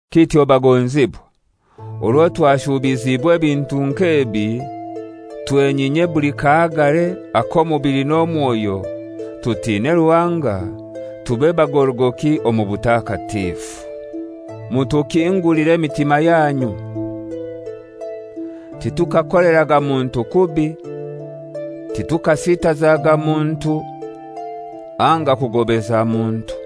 Kityo bagonzibwa, orwo twashubiziibwe ebintu nk'ebi, twenyinye buli kahagare ak'omubili n'omwoyo, tutine Ruhanga, tube bagorogoki omu butakatifu. Mutukingulire emitima yanyu. Titukakoleraga muntu kubi; titukasitazaga muntu, anga kugobeza muntu.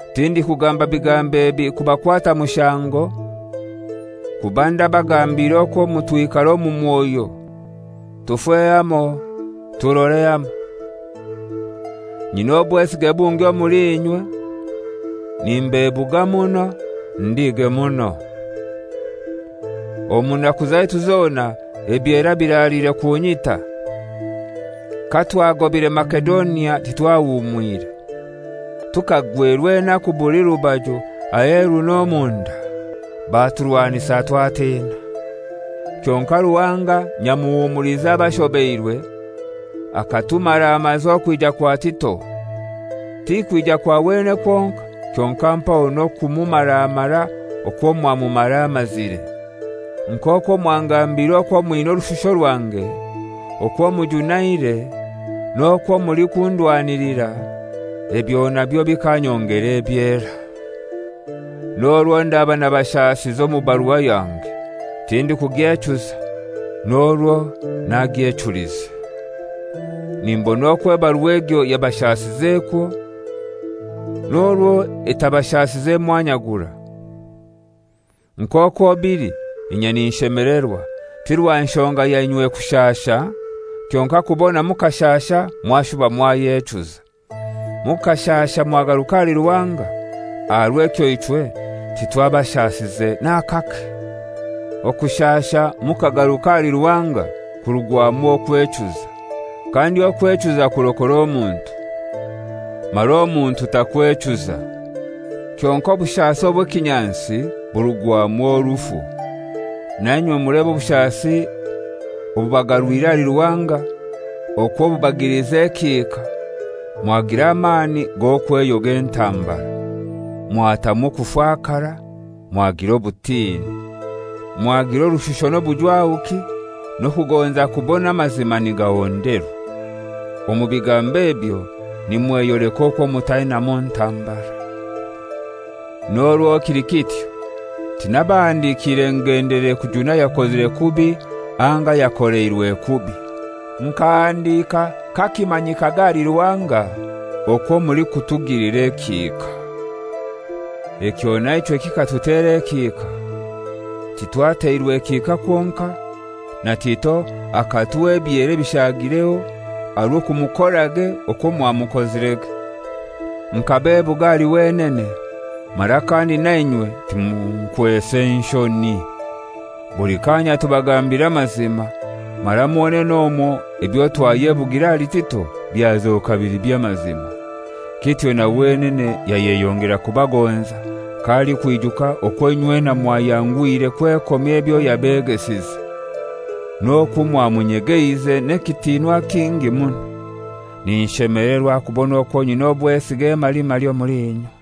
Tindikugamba bigambo ebi kubakwata mushango, kuba ndabagambiire okwo mutwikara omu mwoyo, tufe hamoi, turore hamoi. Nyina obwesige bungi omuli inywe; nimbebuga muno, ndige muno. Omu naku zaitu zona ebyera biraliire kunyita. Katwagobire Masedonia, titwahumwire. Tukagwerwa enaku buli rubaju, aheru n'omunda: Baturwanisa twatina. Kyonkai Ruhanga nyamuhumuliza abashobeirwe, akatumaramaza okwija kwa Tito, tikwija kwa wenene kwonkai, kyonkai mpaho n'okumumaramara okwo mwamumaramazire. Nk'okwo mwangambiire okwo mwina orushusho rwange, okwo mujunaire, n'okwo mulikundwanilira, ebyo nabyo bikanyongera ebyera. N'orwo ndaba nabashasize omu barua yange, tindikugyechuza (n'orwo nagyechulize). Nimbona okwo ebarua egyo yabashasizekwo, n'orwo etabashasize mwanya gurai. Nk'okwo bili, inye ninshemelerwa, ti rwa nshonga ya inywe kushasha, kyonkai kubona mukashasha mwashuba mwayechuza; mukashasha mwagaruka ahali Ruhanga, aha rw'ekyo ichwe titwabashasize n'akake. Okushasha mukagaruka ahali Ruhanga kurugwamu okwechuza; kandi okwechuza kurokora omuntu, mara omuntu takwechuza. Kyonkai obushasi obw'ekinyansi burugwamu orufu. Na inywe mulebe obushasi obubagarwire ahali Ruhanga okwo bubagilize ekihika, mwagira amani g'okweyoga entambara, mwatamwa okufakara, mwagira obutini, mwagira orushusho n'obujwahuki, n'okugonza kubona amazima nigahonderwa. Omu bigambo ebyo nimweyoleka okwo mutainamu ntambara. N'orwo kili kityo tinabahandikiire ngendeleire kujuna ayakozire kubi anga ayakoleirwe kubi. Nkahandika kakimanyikage ahali Ruhanga okwo mulikutugilira ekihika. Ekyo na ichwe kikatutera ekihika. Titwateirwe kihika kwonkai; na Tito akatuha ebyera ebishagireho aha rw'okumukorage okwo mwamukozirege. Nkabebuga ahali wenene, mara kandi na inywe timunkwese nshoni. Buli kanya tubagambira amazima, mara mwonene omwo ebyo twayebugire ahali Tito byazoka bili by'amazima. Kityo na wenene yayeyongera kubagonza, k'alikwijuka okwo inywena mwayanguhire kwekomya ebyo yabegesize, n'okwo mwamunyegeize n'ekitinwa kingi muno. Ninshemelerwa kubona okwo nyina obwesige emalimali omuli inywe.